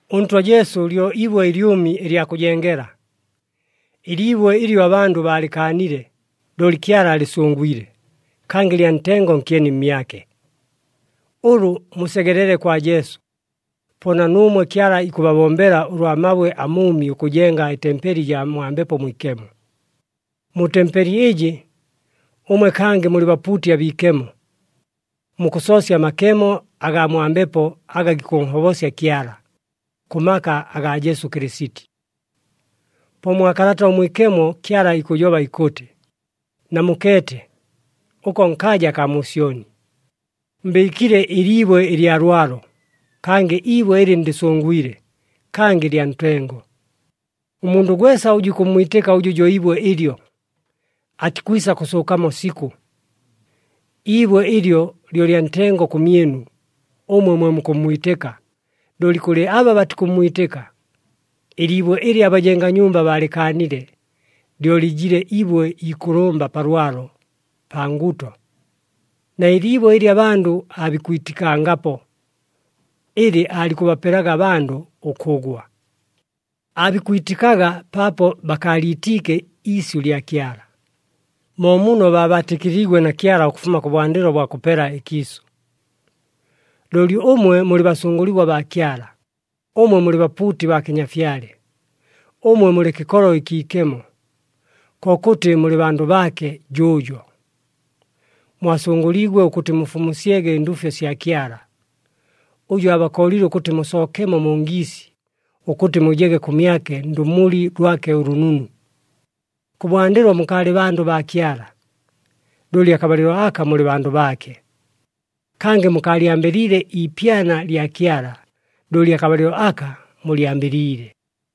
ɄNtwa Jesu lyo ibwe ɨlyʉmi ɨlya kʉjengela. Ɨliibwe ɨlyo abandʉ baalɨkaanile, looli Kyala alɨsʉngwile, kangɨ lya ntengo nkyeni mmyake. Ʉlʉ musegelele kwa Jesu, po na nuumwe Kyala ikʉbabombela ʉlwa mabwe amʉʉmi ʉkʉjenga ɨtempeli ɨjaa mwa Mbepo Mwikemo. Mu tempeli ɨjɨ, ʉmwe kangɨ mulɨ bapuuti abiikemo. Mukʉsoosya amakemo agaa mwa Mbepo aga gikʉnhobosya Kyala, kʉ maka agaa Jesu Kɨlɨsiti. Po mwa Kalata ʉMwikemo Kyala ikʉjoba ikʉtɨ, “Namukeete, ʉko nkaaja akaa mu Syoni, mbɨɨkile ɨliibwe ɨlya lwalo, kangɨ ibwe ɨlɨ ndɨsʉngwile, kangɨ lya ntengo. Ʉmundʉ gwesa ʉjʉ ikʉmmwitɨka ʉjʉ jo ibwe ɨlyo, atikwisa kʉsʉʉkamo sikʉ.” Iibwe ɨlyo lyo lya ntengo kʉmyɨnu ʉmwe mwe mukʉmmwitɨka, looli kʉlɨ aba batikʉmmwitɨka, “Ɨliibwe ɨlɨ abajenga nyumba baalɨkaanile, lyo lɨjile ibwe ikʉlʉmba pa lwalo, pa nguto,” na, “Ɨliibwe ɨlɨ abandʉ aabikwitikangapo, ɨlɨ aalikʉbapelelaga abandʉ ʉkʉgwa.” Aabikwitikaga paapo bakaaliitiike iisyʉ lya Kyala, mo muno baabaatɨkɨliigwe na Kyala ʉkʉfuma kʉbwandɨlo bwa kʉpela ɨkiisʉ. Looli ʉmwe mulɨ basʉngʉligwa baa Kyala, ʉmwe mulɨ bapuuti baa kɨnyafyale, ʉmwe mulɨ kɨkolo ɨkiikemo, kokʉtɨ mulɨ bandʉ baake jʉʉjo. Mwasʉngʉliigwe ʉkʉtɨ mufumusyege ɨnduufyo sya Kyala, ʉjʉ aabakooliile ʉkʉtɨ musookemo mu ngiisi, ʉkʉtɨ mujege kʉmyake ndʉmuli lwake ʉlʉnunu. Kʉbwandɨlo mukaalɨ bandʉ baa Kyala, looli akabalɨlo aka mulɨ bandʉ baake. Kangɨ mukaalyambɨliile iipyana lya Kyala, looli akabalɨlo aka mulyambɨliile.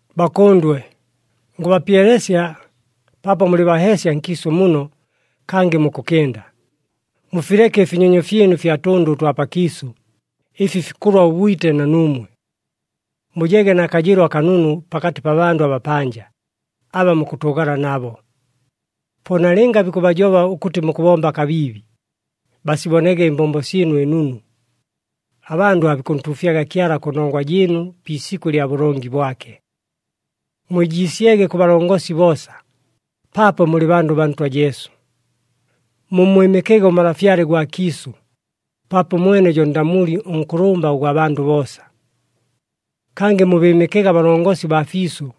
Bakʉndwe, ngʉbapyelesya, paapo mulɨ baheesya nkiisʉ muno kangɨ mukʉkɨnda, mufileke ɨfinyonyo fyɨnu ɨfya tʉndʉ ʉtwa pakiisʉ, ɨfi fikʉlwa ʉbwite na nuumwe. Mujege na kajɨɨlo akanunu pakatɨ pa bandʉ abapanja, aba mukʉtʉʉgala nabo. Po nalɨnga bikʉbajoba ʉkʉtɨ mukʉbomba kabiibi, basibonege ɨmbombo syɨnu ɨnunu, abandʉ aabikʉntuufyaga Kyala kʉnongwa jɨɨnu pi isikʉ lya bʉlongi bwake. Mwijiisyege kʉ balongosi boosa, paapo mulɨ bandʉ baa Ntwa Jesu. Mummwɨmɨkege ʉmalafyale gwa kiisʉ, paapo ʉmwene jo ndamuli ʉnkʉlʉmba ʉgwa bandʉ boosa. Kangɨ mubɨɨmɨkege abalongosi baa fiisʉ,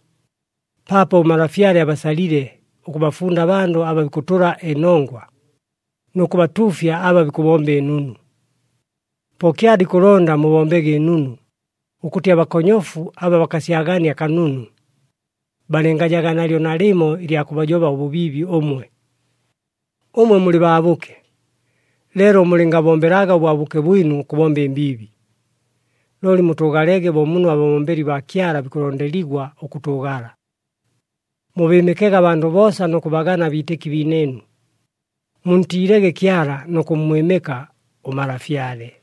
paapo ʉmalafyale abasalile ʉkʉbafunda abandʉ aba bikʉtʉla ɨnongwa, nʉ kʉbatuufya aba bikʉbomba ɨnunu. Po Kyala ikʉlonda mubombege ɨnunu, ʉkʉtɨ abakonyofu aba bakasyagania kanunu, balɨngajaga nalyo nalɨmo ɨlya kʉbajoba ʉbʉbiibi ʉmwe. Ʉmwe mulɨ baabʉke, leelo mulɨngabombelaga ʉbwabʉke bwɨnu ʉkʉbomba ɨmbiibi, looli mutʉʉgalege bo muno ababombeli baa Kyala bikʉlondeligwa ʉkʉtʉʉgala. Mubɨɨmɨkege abandʉ boosa nʉ kʉbagana abiitɨki biinɨɨnu. Muntiilege Kyala nʉ kʉmmwɨmɨka ʉmalafyale.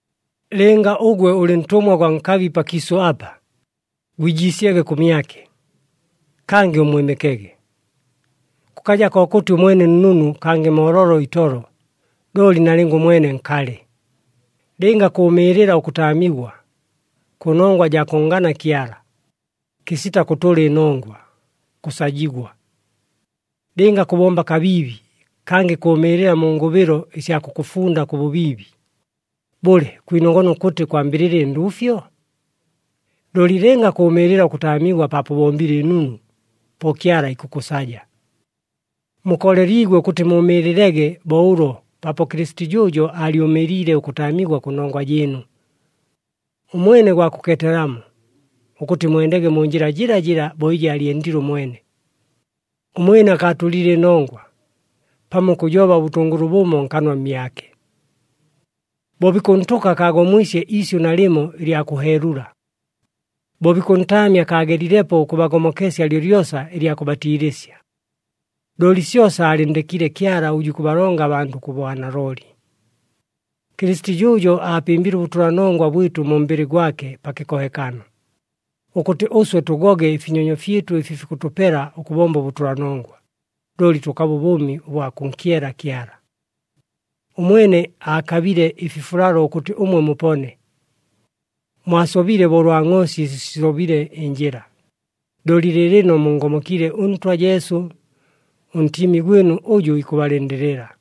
Lɨnga ʉgwe ʉlɨ ntʉmwa gwa nkabi pakiisʉ apa, gwijiisyege kʉmyake, kangɨ ʉmmwɨmɨkege. Kʉkaja kokʉtɨ ʉmwene nnunu kangɨ mooloolo itolo, looli nalɨnga ʉmwene nkalɨ. Lɨnga kʉʉmɨɨlɨla ʉkʉtaamigwa, kʉ nongwa jaa kʉnngana Kyala, kɨsita kʉtʉla ɨnongwa, kʉsajigwa. Lɨnga kʉbomba kabiibi kangɨ kʉʉmɨɨlɨla mu ngʉbɨlo ɨsya kʉkʉfunda kʉ bʉbiibi, bʉle kwinogona ʉkʉtɨ kwambɨlɨla ɨnduufyo? Looli lɨnga kʉʉmɨɨlɨla ʉkʉtaamigwa paapo ʉbombile ɨnunu, po Kyala ikʉkʉsaja. Mukooleliigwe ʉkʉtɨ mʉʉmɨɨlɨlege bo ʉlo paapo Kɨlɨsiti jʉʉjo aalyʉmɨɨliile ʉkʉtaamigwa kʉnongwa jɨɨnu. Ʉmwene gwa kʉkeetelamo, ʉkʉtɨ mwendege mu njɨla jɨlajɨla bo ɨjɨ aalyendile ʉmwene. “Ʉmwene akaatʉlile ɨnongwa, pamo ʉkʉjoba ʉbʉtʉngʉlʉ bʉmo nkanwa mmyake.” Bo bikʉntʉka akaagomwisye iisyʉ nalɨmo ɨlya kʉheelula. Bo bikʉntaamya akaagelilepo ʉkʉbagomokesya lyolyosa ɨlya kʉbatiilɨsya. Looli syosa aalɨnndekiile Kyala ʉjʉ ikʉbalonga abandʉ kʉ bwanalooli. Kɨlɨsiti jʉʉjo aapɨmbile ʉbʉtʉlanongwa bwɨtʉ mu mbɨlɨ gwake pa kɨkohekano, ʉkʉtɨ ʉswe tʉgoge ɨfinyonyo fyɨtʉ ɨfi fikʉtʉpela ʉkʉbomba ʉbʉtʉlanongwa, looli tʉkabe ʉbʉʉmi ʉbwa kʉnkyela Kyala. Ʉmwene aakabile ɨfifulalo ʉkʉtɨ ʉmwe mupone. Mwasobile bo ʉlwa ngʼoosi ɨsi sisobile ɨnjɨla, looli lɨɨlɨno munngomokiile ʉNtwa Jesu, ʉNtiimi gwɨnu ʉjʉ ikʉbalɨndɨlɨla.